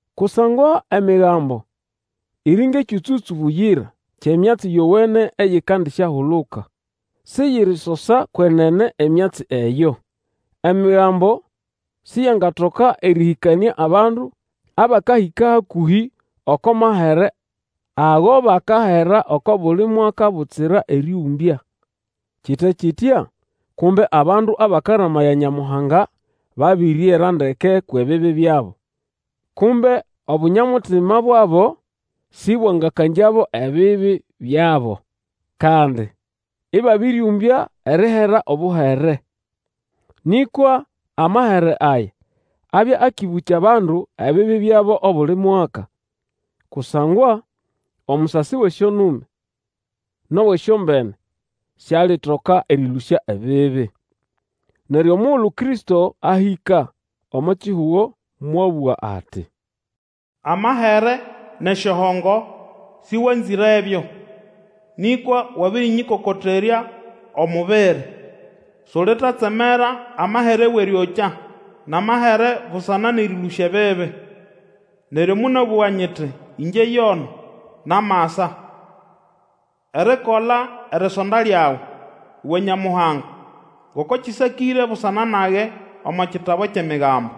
Kusangwa Emigambo iri ngʼekyũtsũ-tsũ buyira kyʼemyatsi yowene eyikandisyahuluka. Siyirisosa kwenene emyatsi eyo. Emigambo siyangatoka erĩhĩkanĩa abandu abakahĩka hakũhĩ oko mahere ago bakahera oko buli mwaka butsira erĩũmbya. Kite kitya, kumbe abandu abakaramaya Nyamuhanga babiriera ndeke kwʼebibi byabo, kumbe obunyamutima bwabo sĩbwangakangyabo ebibi byabo. Kandi ĩbabĩrĩũmbya erihera obuhere. Nĩkwa amahere aya, abya akĩbũkya abandu ebibi byabo obuli mwaka. Kusangwa omusasi wʼesyonume nʼowʼesyombene sialitoka erĩlũsya ebibi. Neryo omugulu Kristo ahĩka omo kihugo mwabũga ati, Amahere nʼesyohongo, sĩwanzĩrebyo, Nĩkwa wabĩrĩnyĩkokoterya omubiri. Sulitatsemera amahere wʼerĩokya nʼamahere busana nʼerĩlũsya ebibi. Neryo monabũga nyiti, Ĩngye yono, namasa. Erikola erisonda lyawe, uwe Nyamuhanga, Ngoko kĩsakĩre busana nage omo kitabu kyʼEmigambo.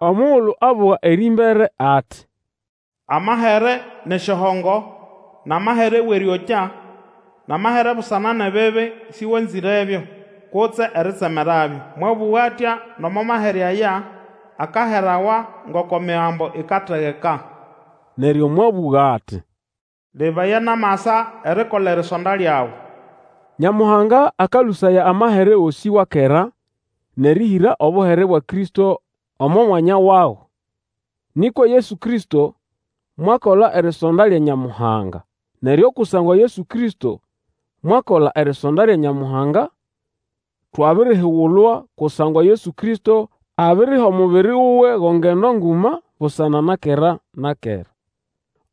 Omugulu abũga erĩmbere ati, Amahere nʼesyohongo, nʼamahere wʼerĩokya nʼamahere busana nʼebibi, sĩwanzĩrebyo kutse eritsemerabyo. Mwabũga atya nomo amahere aya akaherawa ngoko Emigambo ikategeka. Neryo mwabũga ati, Lebaya, namasa erikola erisonda lyawe. Nyamuhanga akalũsaya amahere gosĩ wa kera nʼerĩhĩra obuhere bwa Kristo omo mwanya wago. Nĩkwa Yesu Kristo mwakola erisonda lya Nyamuhanga. Neryo kusangwa Yesu Kristo mwakola erisonda lya Nyamuhanga, twabirihigulwa, kusangwa Yesu Kristo abiriha omubiri wuwe go ngendo nguma busana na kera na kera.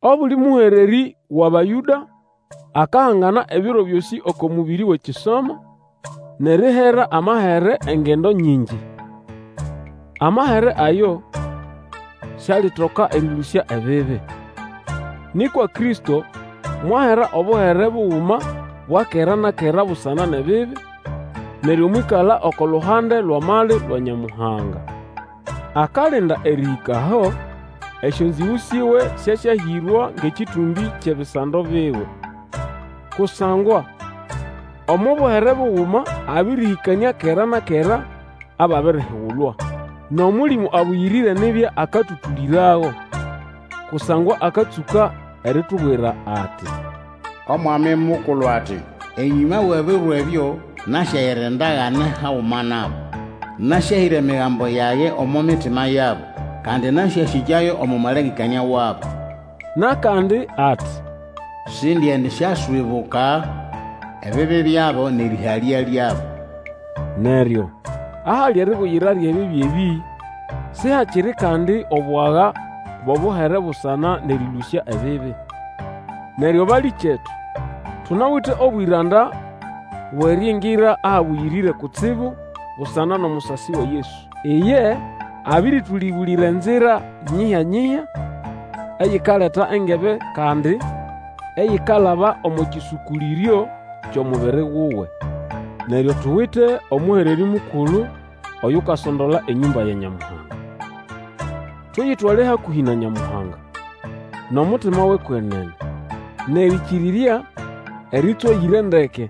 Obuli mũhererĩ wʼAbayũda akahangana ebiro byosĩ oko mũbĩrĩ wʼekisomo, nʼerihera amahere engendo nyingi. Amahere ayo sialitoka erĩlũsya ebibi. Nĩkwa Kristo mwahera obuhere buguma bwa kera na kera busana nʼebibi, neryo mwĩkala oko luhande lwʼamali lwa Nyamuhanga. Akalinda erĩhĩka aho esyonzĩgũ siwe syasyahĩrwa ngʼekĩtũmbĩ kyʼebisando biwe. Kusangwa omo buhere buguma abĩrĩhĩkanĩa kera na kera ababirihigulwa. NʼOmũlĩmũ Abũyĩrĩre nibya akatũtũlĩrago; kusangwa akatsũka eritubwira ati, Omwami Mukulu ati, Enyũma wʼebiro ebyo, nasyayira endagane haguma nabo. Nasyahĩra emigambo yage omo mitima yabo, Kandi nasyasĩkyayo omo malengekanĩa wabo. Nʼakandi ati, Sindiendisyaswibuka ebibi byabo, nʼerĩhalya lyabo. Neryo ahali eribuyira lyʼebibi ebĩ, sihakiri kandi obwaga bwʼobuhere busana nʼerĩlũsya ebibi. Neryo balĩkyetu, tunawite obwĩranda bwʼeriingira Ahabũyĩrĩre Kutsibu busana nʼomusasi wa Yesu. Iye abĩrĩtũlĩbũlĩra enzira nyihya-nyihya, eyikaleta engebe, kandi eyikalaba omo kĩsũkũlĩryo kyʼomubiri wuwe. Neryo tuwite omũhererĩ mukulu Oyukasondola enyũmba ya Nyamuhanga. Tuyitwale hakũhĩ na Nyamuhanga, nʼomutima wʼekwenene, nʼerĩkĩrĩrya erĩtswayĩre ndeke,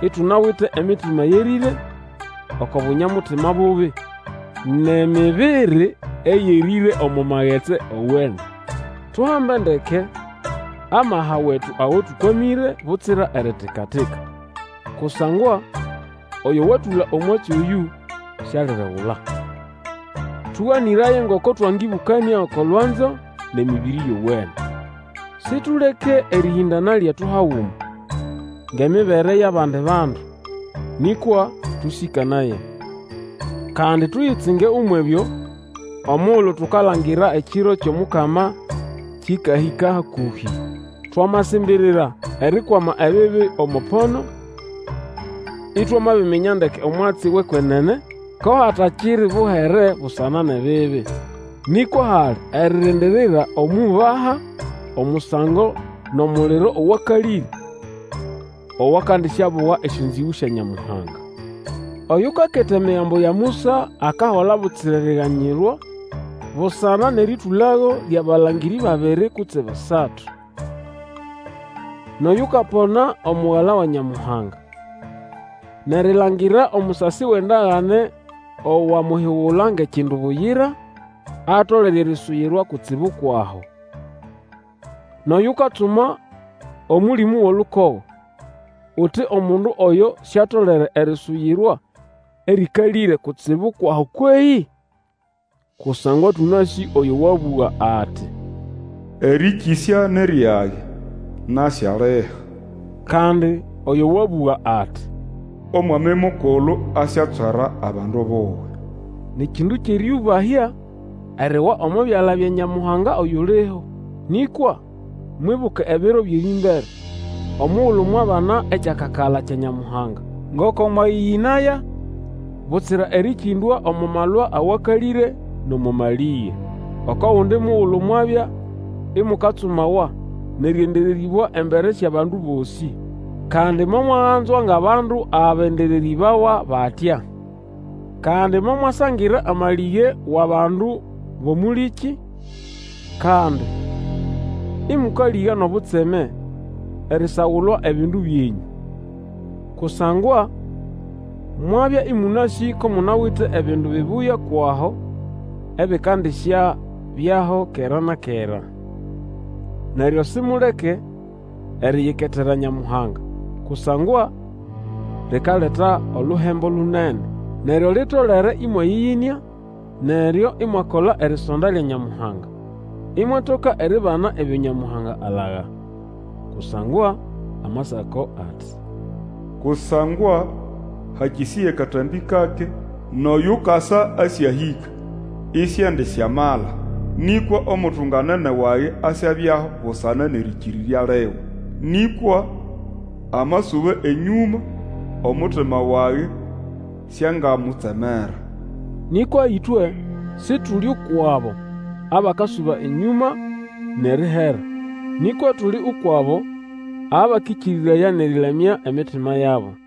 itunawite emitima yerĩre oko bunya-mutima bubi, nʼemibiri eyerĩre omo magetsi owene. Tuhambe ndeke amaha wetu ago tũkwamĩre, butsira eritika-tika, kusangwa oyo watũla omwatsi oyũ sialiregula. Tũganĩraye ngoko twangĩbũkanĩa oko lwanzo nʼemĩbĩrĩ yowene. Situleke erĩhĩndana lyetu haguma, ngʼemibere yʼabandi bandu, nĩkwa tũsĩkanaye. Kandi tuyitsinge umwʼebyo, omugulu tukalangira ekiro kyʼomukama kĩkahĩka hakũhĩ. Twamasimbirira erikwama ebibi omo pono, itwamabiminya ndeke omwatsi wʼekwenene, ko hatakiri buhere busana nʼebibi. Nĩkwa hali eririndirira omwʼiubaha omusango nʼomuliro owakalĩre, owakandisyabuga esyonzĩgũ sya Nyamuhanga. Oyukaketa Emigambo ya Musa akahola butsira eriganyirwa busana nʼerĩtũlago lyʼabalangĩrĩ babiri kutse basatu. Nʼoyukapona Omugala wa Nyamuhanga, nʼerilangira omusasi wʼendagane owamuhigula ngʼekindu buyira, atolere erisuyirwa kutsibu kwʼaho. Nʼoyukatsuma Omũlĩmũ wʼolukogo, uti omundu oyo siatolere erisuyirwa erĩkalĩre kutsibu kwʼaho kwehĩ? Kusangwa tũnasĩ oyo wabũga ati, Erĩkĩsya ni ryage, nasyaliha. Kandi oyo wabũga ati, Omwami Mukulu asyatswera abandu buwe. Ni kindu kyʼerĩũbahya eriwa omo byala bya Nyamuhanga oyuliho. Nĩkwa mwibuke ebiro byʼerĩmbere, omugulu mwabana ekyakakala kya Nyamuhanga, ngoko mwayĩyĩnaya butsira erĩkĩndwa omo malwa awakalĩre, nʼomo malĩge. Oko gundi mugulu mwabya imukatsumawa nʼerĩendererĩbwa embere syʼabandu bosĩ. Kandi momwaganzwa ngʼabandu abendererĩbawa batya. Kandi momwasangira amalĩge wʼabandu bʼomũlĩkĩ, kandi ĩmũkalĩga nʼobutseme erisagulwa ebindu byenyũ. Kusangwa mwabya ĩmũnasĩ ko munawite ebindu bibuya kwʼaho ebikandisyabyaho kera na kera. Neryo simuleke eriyiketera Nyamuhanga, kusangwa likaleta oluhembo lunene. Neryo litolere ĩmwayĩyĩnĩa, neryo imwakola erisonda lya Nyamuhanga, imwatoka eribana ebyo Nyamuhanga alaga. Kusangwa Amasako ati, Kusangwa hakĩsĩya katambĩ kake Nʼoyukasa asyahĩka; I siendisyamala. Nĩkwa omutunganene wage asyabyaho busana nʼerĩkĩrĩrya liwe. Nĩkwa amasuba enyũma, omutima wage siangamutsemera. Nĩkwa ĩtwe Situli ukwʼabo abakasuba enyũma nʼerihera, nĩkwa tuli ukwʼabo abakĩkĩrĩraya nʼerĩlamya emitima yabo.